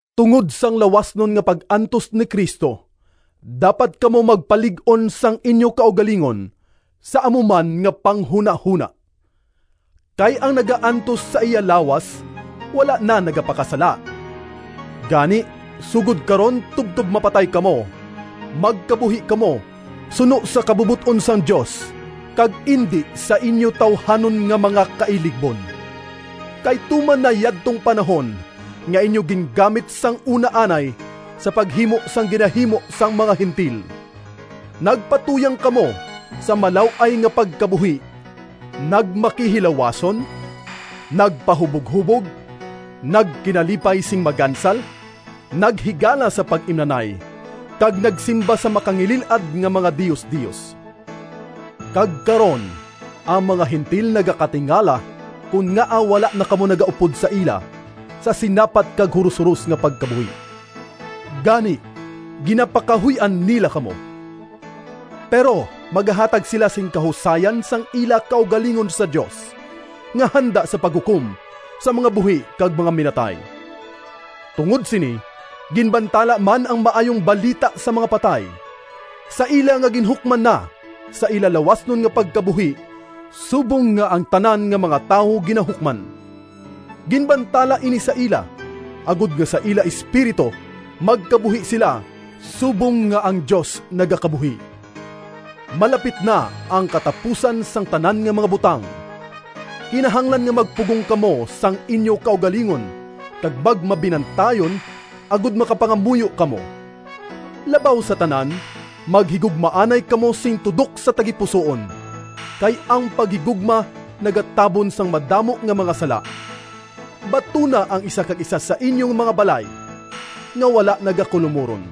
Tungod sang lawasnon nga pag-antos ni Cristo, dapat kamo magpalig-on sang inyo kaugalingon sa amo man nga panghunahona. Kay ang naga-antos sa iya lawas wala na nagapakasala. Gani, sugod karon tubtob mapatay kamo, magkabuhi kamo suno sa kabubot-on sang Dios kag indi sa inyo tawuhanon nga mga kailigbon. Kay tuman na yadtong panahon nga inyo gingamit sang una anay sa paghimo sang ginahimo sang mga Gentil. Nagpatuyang kamo sa malaw-ay nga pagkabuhi, nagmakihilawason, nagpahuboghubog, nagkinalipay sing magansal, naghigala sa pag-imnanay, kag nagsimba sa makangilil-ad nga mga diosdios. Kag karon ang mga Gentil nagakatingala kon ngaa wala na kamo nagaupod sa ila sa sinapat kag hurohuros nga pagkabuhi. Gani, ginapakahuy-an nila kamo. Pero magahatag sila sing kahusayan sang ila kaugalingon sa Dios, nga handa sa paghukom sa mga buhi kag mga minatay. Tungod sini ginbantala man ang Maayong Balita sa mga patay, sa ila nga ginhukman na sa ila lawasnon nga pagkabuhi subong nga ang tanan nga mga tawo ginahukman. Ginbantala ini sa ila, agod nga sa ila espiritu, magkabuhi sila subong nga ang Dios nagakabuhi. Malapit na ang katapusan sang tanan nga mga butang. Kinahanglan nga magpugong kamo sang inyo kaugalingon kag magmabinantayon, agod makapangamuyo kamo. Labaw sa tanan, maghigugmaanay kamo sing tudok sa tagipusoon, kay ang paghigugma nagatabon sang madamo nga mga sala. Batuna ang isa kag isa sa inyo mga balay, nga wala nagakulomuron.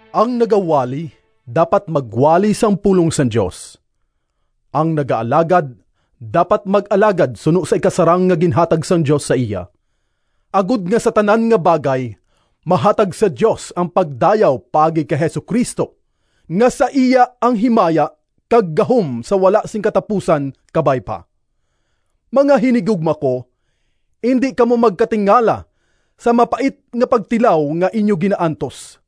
Ang nagawali, dapat magwali sang pulong sang Dios. Ang nagaalagad, dapat mag-alagad suno sa ikasarang nga ginhatag sang Dios sa iya, agod nga sa tanan nga bagay mahatag sa Dios ang pagdayaw paagi kay Jesu-Cristo, nga sa iya ang himaya kag gahom sa wala sing katapusan! Kabay pa. Mga hinigugma ko, indi kamo magkatingala sa mapait nga pagtilaw nga inyo ginaantos,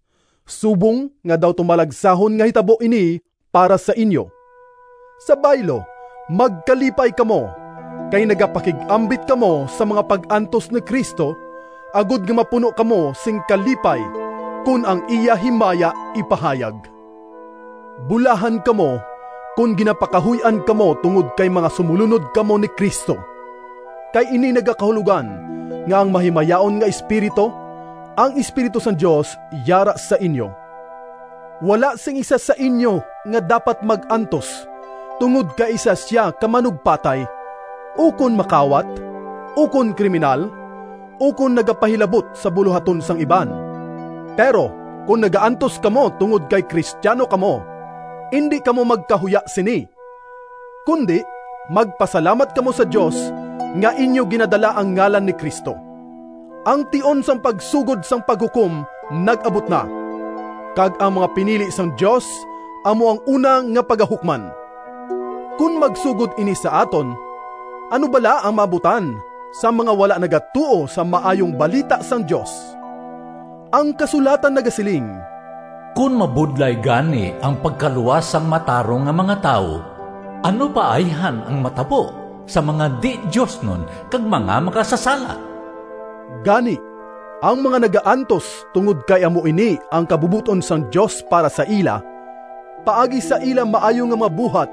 subong nga daw tumalagsahon nga hitabo ini para sa inyo. Sa baylo, magkalipay kamo, kay nagapakig-ambit kamo sa mga pag-antos ni Cristo, agod nga mapuno kamo sing kalipay kon ang iya himaya ipahayag. Bulahan kamo kon ginapakahuy-an kamo tungod kay mga sumolunod kamo ni Cristo, kay ini nagakahulogan nga ang mahimayaon nga Espiritu, ang Espiritu sang Dios, yara sa inyo. Wala sing isa sa inyo nga dapat mag-antos tungod kay isa sia ka manugpatay, ukon makawat, ukon kriminal, ukon nagapahilabot sa bulohaton sang iban. Pero kon nagaantos kamo tungod kay Cristiano kamo, indi kamo magkahuya sini, kundi magpasalamat kamo sa Dios nga inyo ginadala ang ngalan ni Cristo. Ang tion sang pagsugod sang paghukom nag-abot na, kag ang mga pinili sang Dios amo ang una nga pagahukman. Kon magsugod ini sa aton, ano bala ang maabutan sang mga wala nagatuo sa Maayong Balita sang Dios? Ang kasulatan nagasiling: “Kon mabudlay gani ang pagkaluwas Sang matarong nga mga tawo, Ano pa ayhan ang matabo Sa mga di-diosnon kag mga makasasala?” Gani, ang mga nagaantos tungod kay amo ini ang kabubot-on sang Dios para sa ila, paagi sa ila maayo nga mga buhat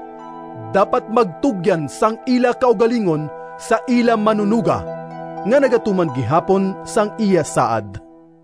dapat magtugyan sang ila kaugalingon sa ila Manunoga, nga nagatuman gihapon sang iya saad.